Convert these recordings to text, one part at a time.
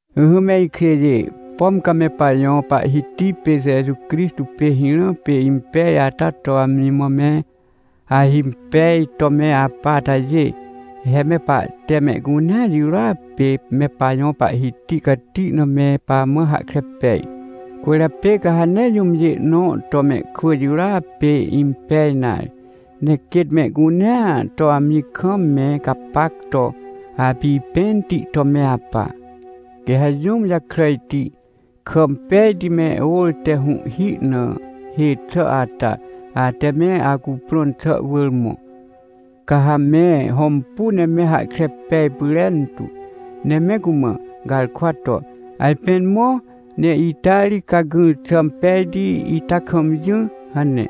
Ỹhỹ me ikjêjê, pom ca me pajõ Pahhiti pê Jeju Crixtô pê hirã pê impej ata to amji mã me ahimpej to me apa atajê, he me pahte mehcunea jirôa pê me pajõ Pahhiti cati na me pamã hahkre pej. Cwỳrjapê ca ha nee jũmjê nõ to mehkwỳ jirôa pê impej nare, ne quêt mehcunea to amji kam me gapac to apipẽnti to me apa. Quê ha jũm jakràjti, kà impejti me ôr te hũhhi na hê xà ata, ate me acuprõn xà wỳr mõ, ca ha me hõmpu ne me hahkre pej pyrentu, ne me cumã garkwa to: — Ajpên mõ, ne ita ri ca gỹr xà impejti ita kam jỹ — hane.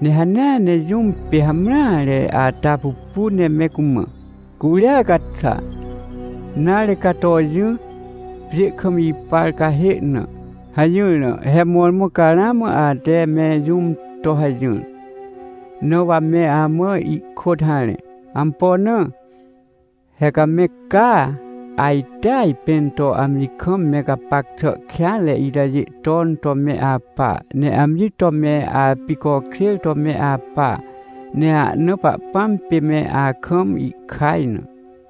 Ne hanea ne jũm pê hamreare ata pupu ne me cumã: — Curia ca xa, nare, ca to jỹ, pjê kam ipar cahê na — hajỹr na, he mõrmõ ca ramã ate me jũm to hajỹr, na wa me amã ihkôt harẽ. Ampo na? He ca me caa, ajte ajpẽn to amji kam me gapac xà kêanre itajê ton to me apa. Ne amji to me apicokjêr to me apa. Ne ahna Pahpãm pê me akam ihkaj na.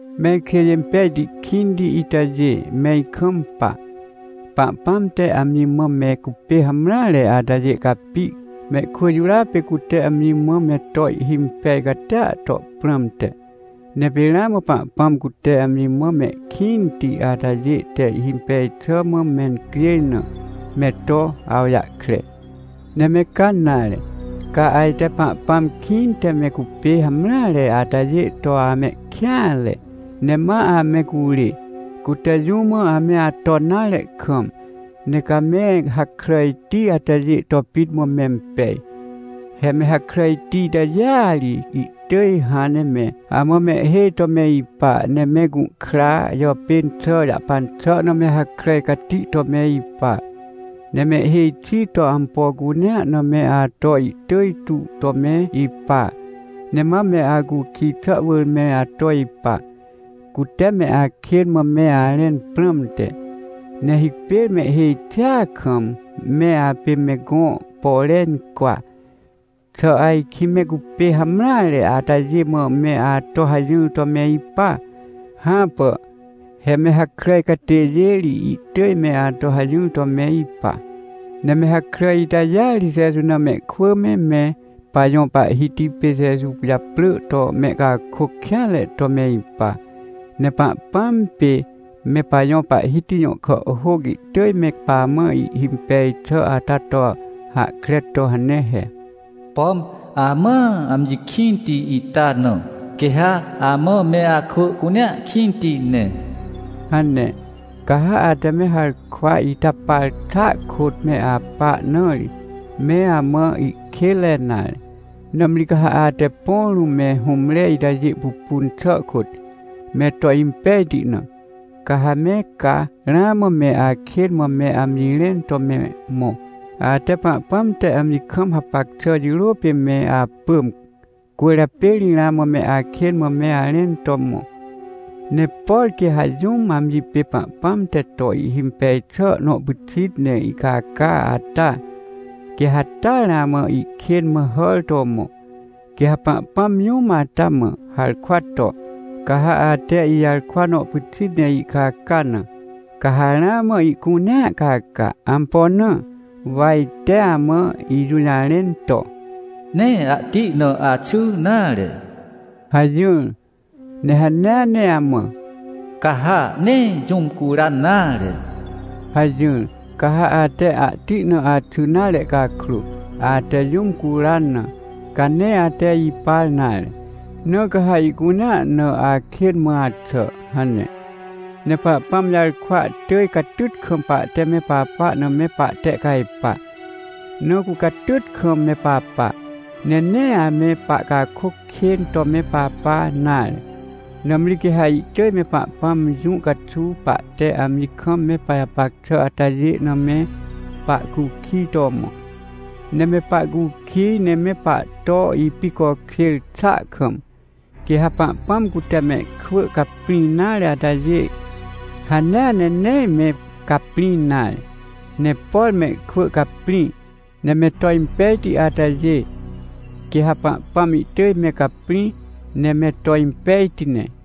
Me ikjêjê impejti kĩnti itajê, me ikampa. Pahpãm te amji mã me cupê hamreare atajê capi, mehkwỳ jirôa pê cute amji mã me to ihhimpej catia to prãmte. Ne pê ramã Pahpãm cute amji mã mehkĩnti atajê te ihhimpej xà mã mencjêj na, me to awjahkre. Ne me ca nare! Ca ajte Pahpãm kĩnte me cupê hamreare atajê to amehkêanre, ne ma ame curê, cute jũ mã ame aton nare kam. Ne ca me hakràjti atajê to pit mã mempej. He me hakràjti itajêa ri ihtỳj hãn ne me amã mehhêj to me ipa, ne me gũhkra jàpên xà jahpan xà na me hakràj cati to me ipa. Ne mehhêj xi to ampo cunea na me ato ihtỳj tu to me ipa. Ne ma me acukij xà wỳr me ato ipa, cute me akên mã me arẽn prãmte, ne hipêr mehhêj xia kam me apê me gõ pore incwa. Xà ajkĩ me cupê hamreare atajê mã me ato hajỹr to me ipa? Hãpà! He me hakràj catêjê ri ihtỳj me ato hajỹr to me ipa. Ne me hakràj itajêa ri Jeju na mehkwỳ me, me pajõ Pahhiti pê Jeju japrỳ to mehcakôc kêanre to me ipa. Ne Pahpãm pê me pajõ Pahhiti jõ kàhhôc ihtỳj me pamã ihhimpej xà ata to hahkre to hane he: “Pom amãa amji kĩnti ita na, quê ha amã me akwỳ cunea kĩnti ne” hane. Ca ha ate me harkwa ita par xàa kôt me apa na ri, me amã ihkênre nare. Nãmri ca ha ate põ rũm me hũmre itajê pupun xà kôt, me to impejti na, ca ha me ca ramã me akên mã me amji rẽn to me mõ. Ate Pahpãm te amji kam hapac xà jirô pê me apỳm, cwỳrjapê ri ramã me akên mã me arẽn to mõ. Ne por quê ha jũm amji pê Pahpãm te to ihhimpej xà nõ pyxit ne ihcaca ata, quê ha taa ramã ihkên mã hàr to mõ. Quê ha Pahpãm jũm ata mã harkwa to: — Ca ha ate ijarkwa nõ pyxit ne ihcaca na, ca ha ramã ihcunea caca. — Ampo na? Wa ite amã ijũjarẽn to: “Nee ahti na axy nare” hajỹr, ne hanea ne amã: “Ca ha nee jũm curan nare” hajỹr. Ca ha ate ahti na axy nare cakrô, ate jũm curan na, ca nee ate ipar nare, na ca ha ihcunea na akên mã axà — hane. Ne Pahpãm jarkwa ihtỳj catyt kam pahte me papa na me pahtehcajpa, na cu catyt kam me papa. Ne nee ame pahcakôc kên to me papa nare. Nãmri quê ha ihtỳj me Pahpãm jũ caxuw pahte amji kam me pajapac xà atajêa na me pahcukij to mõ. Ne me pahcukij ne me pahto ipicokjêr xàa kam, quê ha Pahpãm cute mehkwỳ caprĩ nare atajê, hanea ne nee me caprĩ nare. Ne por mehkwỳ caprĩ, ne me to impejti atajê, quê ha Pahpãm ihtỳj me caprĩ, ne me to impejti ne.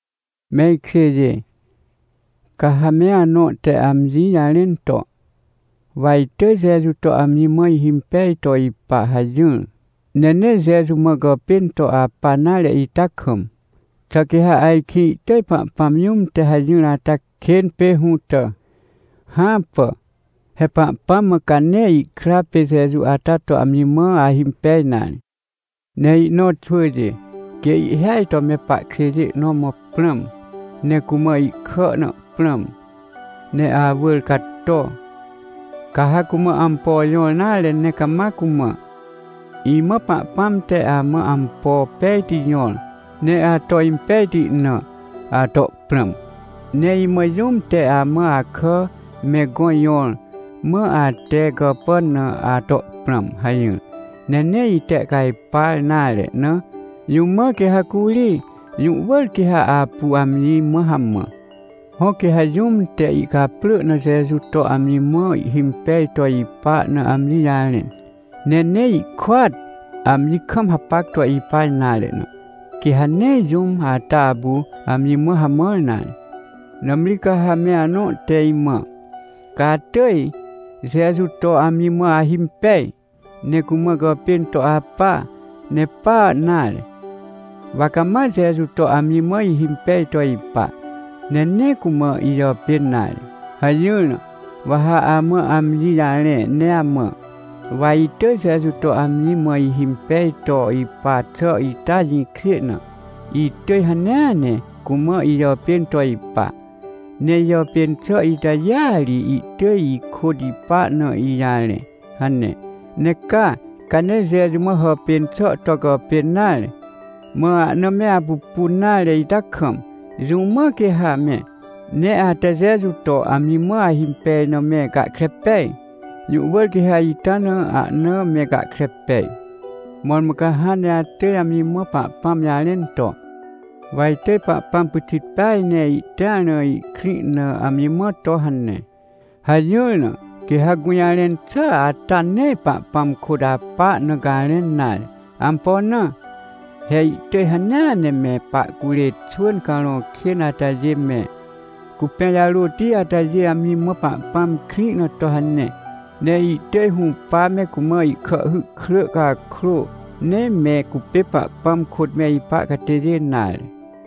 Me ikjêjê, ca ha me anõ te amji jarẽn to: — Wa itỳj Jeju to amji mã ihimpej to ipa — hajỹr, ne nee Jeju mã gàpên to apa nare ita kam, xà quê ha ajkĩ ihtỳj Pahpãm jũm te hajỹr ata kên pê hũtà? Hãpà! He Pahpãm mã ca nee ihkra pê Jeju ata to amji mã ahimpej nare. Ne ihnõ xwỳjê, quê ihhêaj to me pahkjêjê nõ mã prãm, ne cumã ihkà na prãm, ne awỳr cato, ca ha cumã ampo jõr nare ne cama cumã: — Imã Pahpãm te amã ampo pejti jõr, ne ato impejti na, ato prãm. Ne imã jũm te amã akà me gõ jõr, mã ate gàpàn na, ato prãm — hajỹr, ne nee ihtehcajpar nare na, jũ mã quê ha curi? Jũ wỳr quê ha apu amji mã hamã. Hõ, quê ha jũm te ihcaprỳ na Jeju to amji mã ihhimpej to ipa na amji jarẽn, ne nee ihkôat amji kam hapac to ipa nare na, quê ha nee jũm ata apu amji mã hamãr nare. Nãmri ca ha me anõ te imã: — Ca atỳj Jeju to amji mã ahimpej, ne cumã gàpên to apa, ne pa nare, wa cama Jeju to amji mã ihimpej to ipa, ne nee cumã ijàpên nare — hajỹr na, wa ha amã amji jarẽ ne amã: — Wa itỳj Jeju to amji mã ihimpej to ipa xà ita jĩkjê na, itỳj hanea ne cumã ijàpên to ipa. Ne ijàpên xà itajêa ri ihtỳj ikôt ipa na ijarẽ — hane. Ne ca, ca nee Jeju mã hàpên xà to gàpên nare, mã ahna me apupun nare ita kam, jũ mã quê ha me, ne ate Jeju to amji mã ahimpej na me gahkre pej? Jũ wỳr quê ha ita na ahna me gahkre pej! Mõrmõ ca hãn ne atỳj amji mã Pahpãm jarẽn to: — Wa itỳj Pahpãm pyxit peaj ne ihtĩar na ihkrĩ na, amji mã to hane — hajỹr na, quê ha gũjarẽn xà ata nee Pahpãm kôt apa na garẽn nare. Ampo na? He ihtỳj hanea ne me pahcurê xwỳn carõ kên atajê me, cupẽ jarôti atajê amji mã Pahpãm krĩ na to hane, ne ihtỳj hũpa me cumã ihkàhhy krỳ cakrô, nee me cupê Pahpãm kôt me ipa catêjê nare.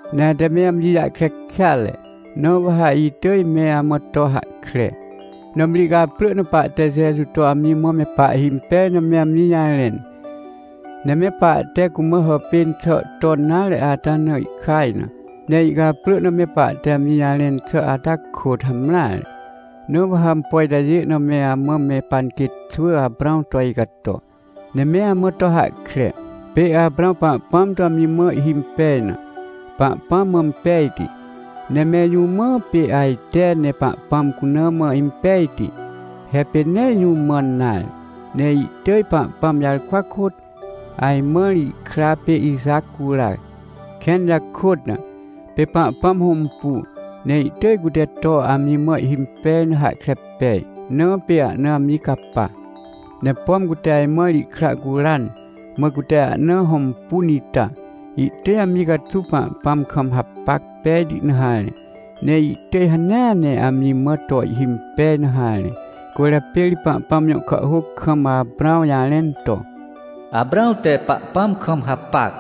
Ne ate me amji jahkre kêatre, na wa ha itỳj me amã to hahkre. Nãmri ihcaprỳ na pahte Jeju to amji mã me pahhimpej na me amji jarẽn, ne me pahte cumã hàpên xà ton nare ata na ihkaj na. Ne ihcaprỳ na me pahte amji jarẽn xà ata kôt hamreare. Na wa ha ampo itajê na me amã me panquêt xwỳAprãw to icato, ne me amã to hahkre. Pê Aprãw Pahpãm to amji mã ihhimpej na, Pahpãm mã impejti. Ne mẽr jũ mã pê ajte ne Pahpãm cuna mã impejti? He pê nee jũ mãn nare. Ne ihtỳj, Pahpãm jarkwa kôt, ajmãr ihkra pê Ixac cura, kẽn jakôt na. Pê Pahpãm hõmpu, ne ihtỳj cute to amji mã ihhimpej na hahkre pej, na pê ahna amji capa. Ne pom cute ajmãr ihkra curan, mã cute ahna hõmpun ita, ihtỳj amji caxuw Pahpãm kam hapac pejti na harẽ, ne ihtỳj hanea ne amji mã to ihhimpej na harẽ. Cwỳrjapê ri Pahpãm jõ kàhhôc kam Aprãw jarẽn to: “Aprãw te Pahpãm kam hapac,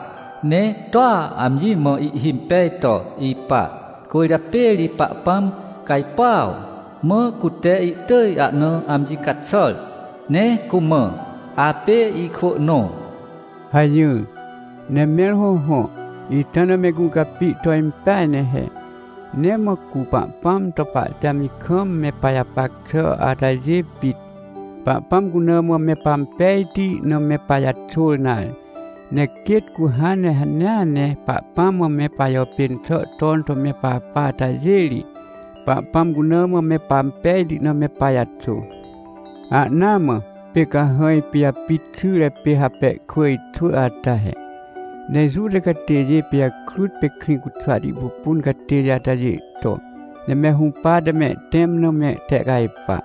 ne toa amji mã ihhimpej to ipa, cwỳrjapê ri Pahpãm cajpuaw, mã cute ihtỳj ahna amji caxàr, ne cumã, ‘Apê ikwỳ nõ’” hajỹr. Ne mẽr hõhõ, ita na me gũcapi to impeaj ne he. Nee mã cu Pahpãm to pahte amji kam me pajapac xà atajê pit, Pahpãm cuna mã me pampejti na me pajaxôr nare. Ne quêt cu hãn ne hanea ne Pahpãm mã me pajàpên xà ton to me papa atajê ri, Pahpãm cuna mã me pampejti na me pajaxô. Ahnaa mã pê cahãj pijapit xyre pê Rapekwỳj xwỳ ata he, ne Juta catêjê pijakrut pê Krĩcuxwati pupun catêjê atajê to ne me hũpate mehtẽm na mehtehcajpa,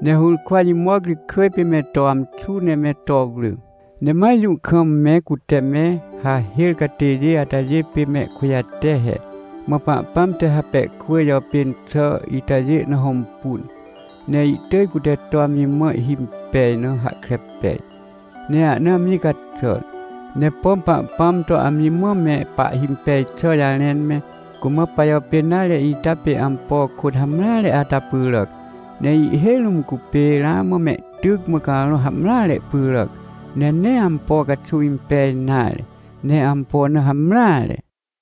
ne hũrkwa jimoc ri kỳj pê me to amxu, ne me to wrỳ, ne ma jũ kam me cute me hahêr catêjê atajê pê mehkujate he. Mã Pahpãm te Rapekwỳj jàpên xà itajê na hõmpun, ne ihtỳj cute to amji mã ihhimpej na hahkre pej, ne ahna amji caxàr. Ne pom Pahpãm to amji mã me pahhimpej xà jarẽn me, cumã pajàpên nare ita pê ampo kôt hamreare ata pyràac. Ne ihhêj rũm cupê ramã mehtyc mã carõ hamreare pyràc, ne nee ampo caxuw impej nare, ne ampo na hamreare.